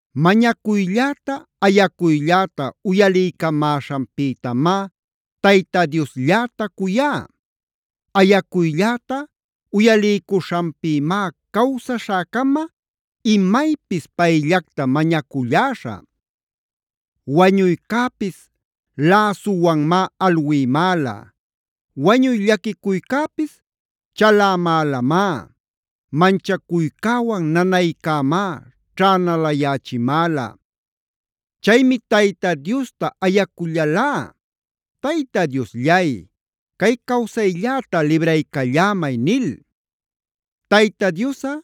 Mañacuylläta, ayacuylläta uyaliycamäśhanpïtamá Tayta Dioslläta cuyá. Ayacuylläta uyaliycuśhanpïmá cawsaśhäcama imaypis payllacta mañaculläśhä. Wañuycäpis läsuwanmá alwïmäla,a wañuy llaquicuycäpis chalämälamá. Manchacuycäwan nanaycämá ćhänalayächimäla. Chaymi Tayta Diosta ayacullalá: “Tayta Diosllay, cay cawsaylläta libraycallämay” nil. Tayta Diosꞌa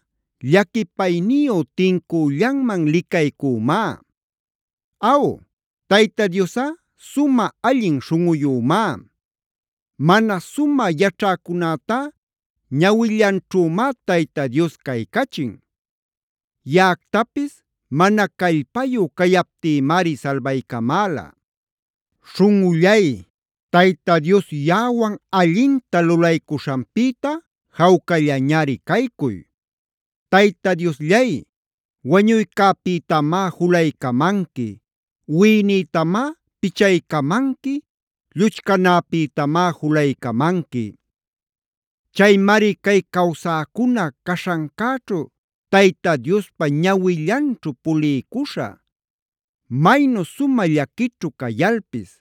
llaquipayniyu tincüllanman licaycümá. Aw, Tayta Diosꞌa sumä allin śhunꞌuyümá. Mana sumä yaćhäcunätá ñawillanćhümá Tayta Dios caycachin. Yaꞌactapis mana callpayu cayaptïmari salbaycamäla. Śhunꞌullay, Tayta Dios yaꞌawan allinta lulaycuśhanpïta, jawcallañari caycuy. Tayta Diosllay wañuycäpïtamá julaycamanqui; wiꞌinïtamá pichaycamanqui, lluchcanäpïtamá julaycamanqui. Chaymari cay cawsäcuna caśhancäćhu Tayta Diospa ñawillanćhu puliycuśhä. Maynu sumä llaquićhu cayalpis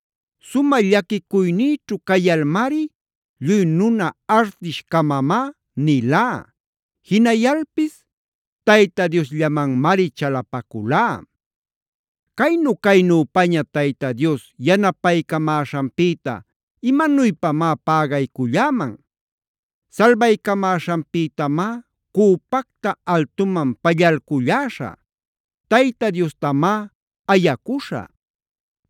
Sumä llaquicuynïćhu cayalmari “Lluy nuna artish-camamá” nilá. Jinayalpis Tayta Diosllamanmari chalapaculá. ¿Caynu-caynüpaña Tayta Dios yanapaycamäśhanpïta imanuypamá pägayculläman? Salbaycamäśhanpïtamá cüpacta altuman pallalculläśhä.c Tayta Diostamá ayacuśhä.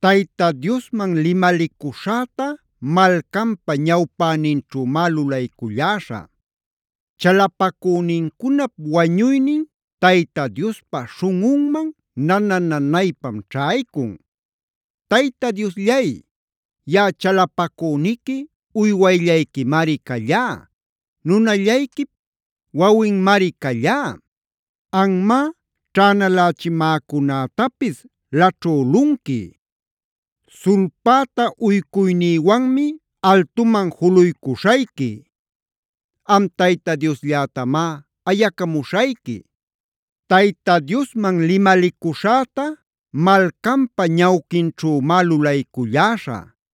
Tayta Diosman limalicuśhäta malcanpa ñawpäninćhümá lulayculläśhä. Chalapacünincunap wañuynin Tayta Diospa śhunꞌunman nana-nanaypam ćhaycun. Tayta Diosllay, yaꞌa chalapacüniqui uywayllayquimari callá; nunallayquip wawinmari callá. Anmá ćhänalächimäcunätapis laćhülunqui. Sulpäta uycuynïwanmi altuman juluycuśhayqui. Am Tayta Diosllätamá ayacamuśhayqui. Tayta Diosman limalicuśhäta malcanpa ñawquinćhümá lulayculläśhä;